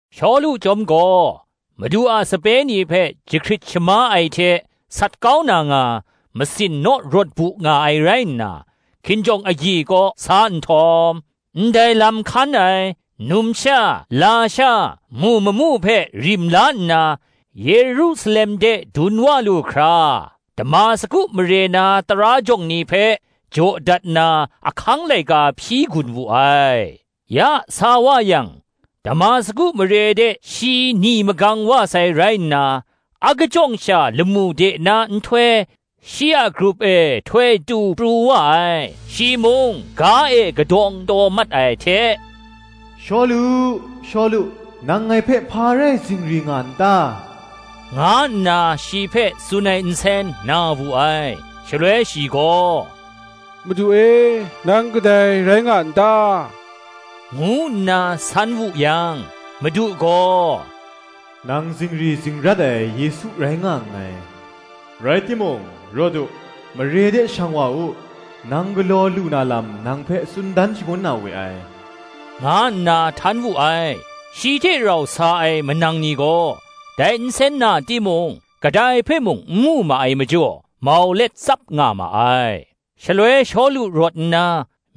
Shawlu chyawm gaw, Madu a sape ni hpe jahkrit shama ai hte sat kau na nga, masin naw rawt bu nga ai rai nna, hkinjawng agyi kaw sa nhtawm, ndai lam hkan ai, numsha lasha mu mamu hpe rim la nna, Yerusalem de dun wa lu hkra, Damasku mare na tara jawng ni hpe, jaw dat na ahkang laika hpyi gun wu ai. Ya sa wa yang, Damasku mare de shi ni magang wa sai rai nna, akajawng sha lamu de na nhtoi shi a grup e htoi tu pru wa ai: shi mung, ga e kadawng taw mat ai hte, “Shawlu, Shawlu, nang ngai hpe hpa rai zingri nga n ta?” nga nna shi hpe tsun ai nsen na wu ai. Shaloi shi gaw, “Madu e, nang kadai rai nga n ta?” ngu nna san wu yang, Madu gaw, “Nang zingri zingrat ai Yesu rai nga nngai: rai timung, rawt u, mare de shang wa u; nang galaw lu na lam nang hpe tsun dan shangun na we ai,” nga nna htan wu ai. Shi hte rau sa ai manang ni gaw, dai nsen na timung, kadai hpe mung n mu ma ai majaw, mau let tsap nga ma ai. Shaloi Shawlu rawt nna,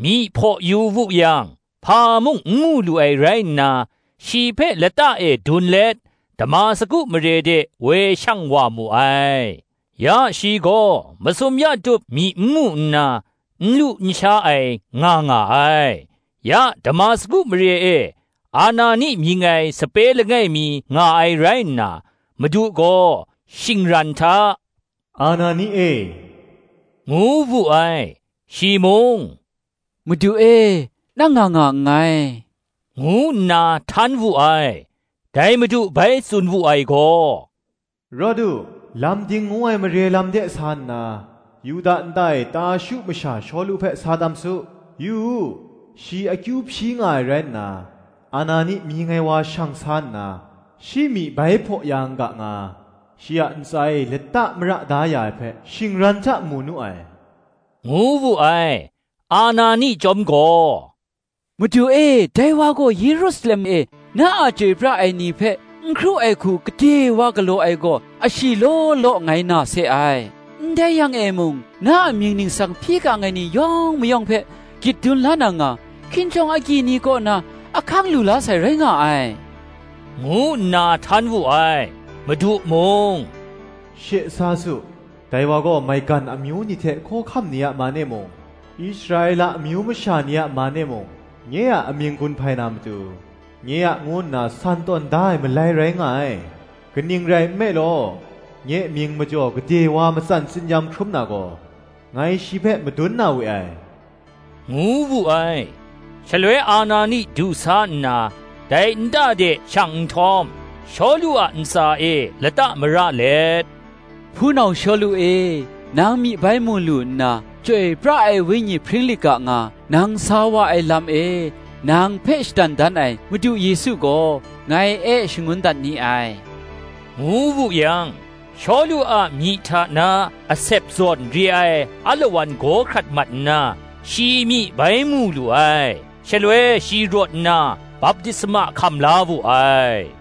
myi hpaw yu wu yang, hpa mung n mu lu ai rai nna, shi hpe lata e dun let, Damasku mare de woi shang wa mu ai. Ya shi gaw masum ya tup myi n mu nna, n lu n sha ai nga nga ai. Ya Damasku mare e Anani mying ai sape langai mi nga ai rai nna, Madu gaw shingran hta, “Anani e,” ngu wu ai. Shi mung, “Madu e, nang nga nga nngai,” ngu nna htan wu ai. Dai Madu bai tsun wu ai gaw, “Rawt u, Lam Ding ngu ai mare lam de sa nna, Yuda nta e, Tarshu masha Shawlu hpe sa tam su; yu u, shi akyu hpyi nga ai rai nna, Anani mying ai wa shang sa nna, shi myi bai hpaw ya n ga nga, shi a ntsa e lata mara da ya ai hpe, shingran hta mu nu ai,” ngu wu ai. Anani chyawm gaw, “Madu e, dai wa gaw Yerusalem e, na a chyoi pra ai ni hpe n hkru ai hku gade wa galaw ai gaw, ashi law law ngai na se ai; ndai yang e mung, na a mying ningsang hpyi gang ai ni yawng mayawng hpe gyit dun la na nga, hkinjawng agyi ni kaw na ahkang lu la sai rai nga ai,” ngu nna htan wu ai. Madu mung, “She sa su; dai wa gaw, maigan amyu ni hte hkawhkam ni a man e mung, Israela amyu masha ni a man e mung, nye a amying gun hpai na matu, nye a ngu nna san tawn da ai malai rai nga ai: kaning rai nme law, nye mying majaw gade wa matsan tsin-yam hkrum na gaw, ngai shi hpe madun na we ai,” ngu wu ai. Shaloi Anani du sa nna, dai nta de shang nhtawm, Shawlu a ntsa e lata mara let, “Hpunau Shawlu e, nang myi bai mu lu nna, Chyoi pra ai Wenyi hpring lit ga nga, nang sa wa ai lam e, nang hpe shadan dan ai Madu Yesu gaw, ngai e shangun dat ni ai,” ngu wu yang, Shawlu a myi hta na asep zawn re ai alawan gaw hkrat mat nna, shi myi bai mu lu ai; shaloi shi rawt nna, baptisma hkam la wu ai: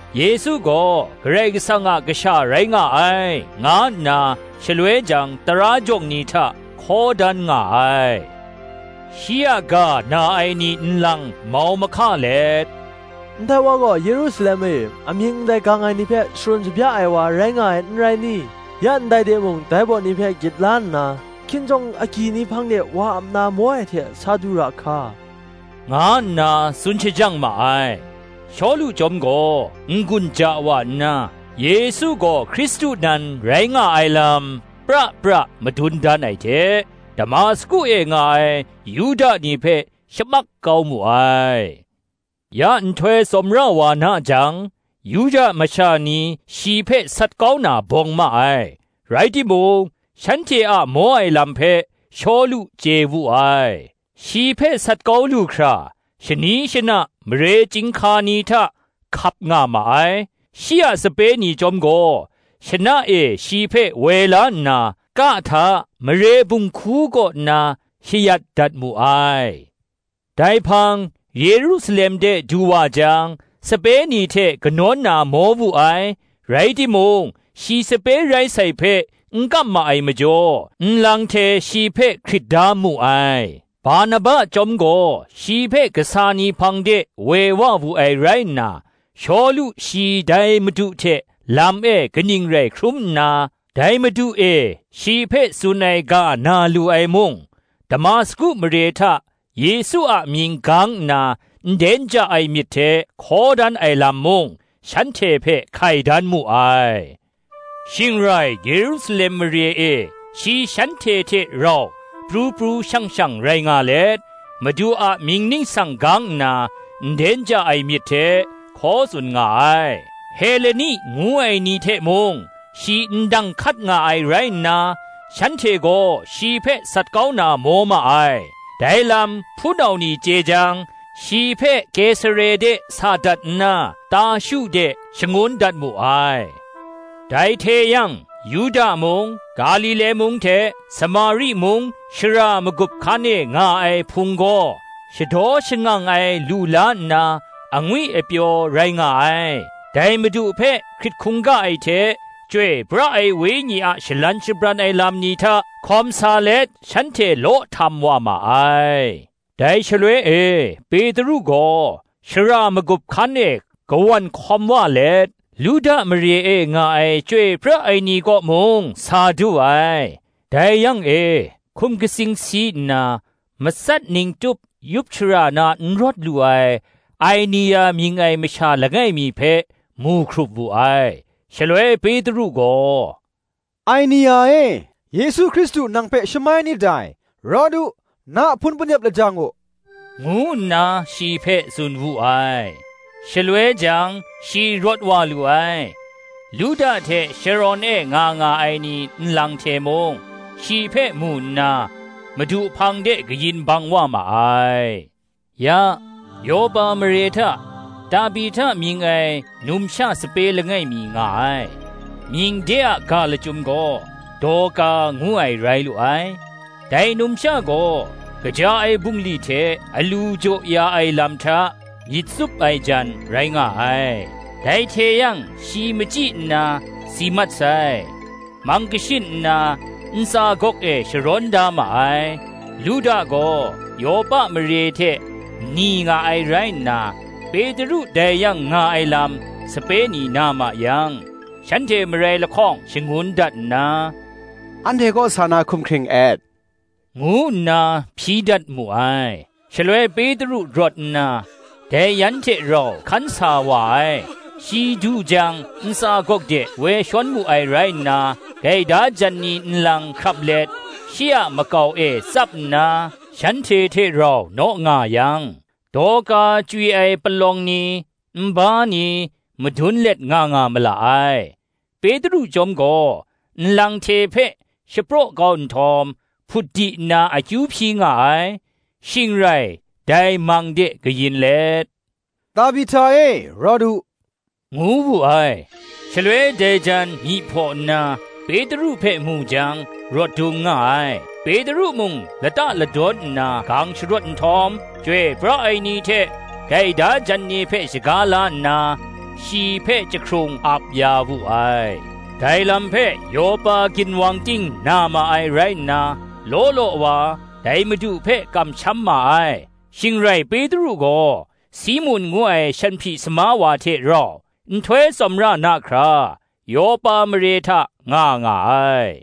Yesu gaw Karai Kasang a kasha rai nga ai, nga nna shaloi jang tara jawng ni hta hkaw dan nga ai. Shi a ga na ai ni nlang mau mahka let, “Ndai wa gaw Yerusalem e amying ndai gang ai ni hpe sharun shabya ai wa rai nga ai, n rai ni? ya ndai de mung, dai baw ni hpe gyit la nna, hkinjawng agyi ni hpang de wa ap na maw ai hte sa du ra hka,” nga nna tsun shajang ma ai. Shawlu chyawm gaw n-gun ja wa nna, Yesu gaw Hkristu nan rai nga ai lam pra pra madun dan ai hte, Damasku e nga ai Yuda ni hpe shamak kau mu ai. Ya nhtoi tsawmra wa na jang, Yuda masha ni shi hpe sat kau na bawng ma ai: rai timung, shanhte a maw ai lam hpe Shawlu chye wu ai. Shi hpe sat kau lu hkra, shani shana mare chyinghka ni hta hkap nga ma ai. Shi a sape ni chyawm gaw, shana e shi hpe woi la nna, ka hta mare bunghku kaw nna shayat dat mu ai. Dai hpang Yerusalem de du wa jang, sape ni hte kanawn na maw wu ai; rai timung, shi sape rai sai hpe n kam ma ai majaw, nlang hte shi hpe hkrit da mu ai. Barnaba chyawm gaw shi hpe kasa ni hpang de woi wa wu ai rai nna, Shawlu shi dai Madu hte lam e kaning rai hkrum nna, dai Madu e shi hpe tsun ai ga na lu ai mung, Damasku mare hta Yesu a mying gang nna nden ja ai myit hte hkaw dan ai lam mung, shanhte hpe hkai dan mu ai. Shing rai Yerusalem mare e shi shanhte hte rau pru pru shang shang rai nga let, Madu a mying ningsang gang nna, nden ja ai myit hte hkaw tsun nga ai; Heleni ngu ai ni hte mung shi ndang hkat nga ai rai nna, shanhte gaw shi hpe sat kau na maw ma ai. Dai lam hpunau ni chye jang, shi hpe Kesare de sa dat nna, Tarshu de shangun dat mu ai. Dai hte yang, Yuda mung, Galile mung hte Samari mung shara magup hkan e nga ai Hpung gaw, shadaw shangang ai lu la nna, angwi apyaw rai nga ai; dai Madu hpe hkrit hkungga ai hte, Chyoi pra ai Wenyi a shalan shabran ai lam ni hta hkawm sa let, shanhte law htam wa ma ai. Dai shaloi e Petru gaw shara magup hkan e kawan hkawm wa let, Luda mare e nga ai chyoi pra ai ni kaw mung sa du ai. Dai yang e hkum katsing si nna, matsat ning tup yup shara na n rawt lu ai Ainea mying ai masha langai mi hpe mu hkrup wu ai. Shaloi Petru gaw, “Ainea e, Yesu Hkristu nang hpe shamai nit dai: rawt u, na hpun panep lajang u,” ngu nna shi hpe tsun wu ai: shaloi jang shi rawt wa lu ai. Luda hte Sharon e nga nga ai ni nlang hte mung shi hpe mu nna, Madu hpang de kayin bang wa ma ai. Ya, Yopa mare hta Tabihta mying ai numsha sape langai mi nga ai; mying de a ga lachyum gaw Dorka ngu ai rai lu ai: dai numsha gaw kaja ai bungli hte alu jaw ya ai lam hta, myit tsup ai jan rai nga ai. Dai hte yang shi machyi nna si mat sai; mang kashin nna, ntsa gawk e sharawn da ma ai. Luda gaw Yopa mare hte ni nga ai rai nna, Petru dai yang nga ai lam sape ni na ma yang, shanhte marai lahkawng shangun dat nna, “Anhte kaw sa na hkum hkring et,” ngu nna hpyi dat mu ai. Shaloi Petru rawt nna, dai yan hte rau hkan sa wa ai. Shi du jang ntsa gawk de woi shawn mu ai rai nna, gaida jan ni nlang hkrap let shi a makau e tsap nna, shanhte hte rau naw nga yang, Dorka chywi ai palawng ni, nba ni, madun let nga nga ma la ai. Petru chyawm gaw nlang hte hpe shapraw kau ai; shing rai dai mang de kayin let, “Tabihta e, rawt u,” ngu wu ai. Shaloi dai jan myi hpaw nna, Petru hpe mu jang, rawt dung nga ai. Petru mung lata ladawn nna gang sharawt nhtawm, chyoi pra ai ni hte gaida jan ni hpe shaga la nna, shi hpe chyahkrung ap ya wu ai. Dai lam hpe Yopa ginwang ting na ma ai rai nna, law law wa, dai Madu hpe kamsham ma ai. Shing rai Petru gaw, Simun ngu ai shanhpyi sama wa hte rau, nhtoi tsawmra na hkra, Yopa mare hta nga nga ai.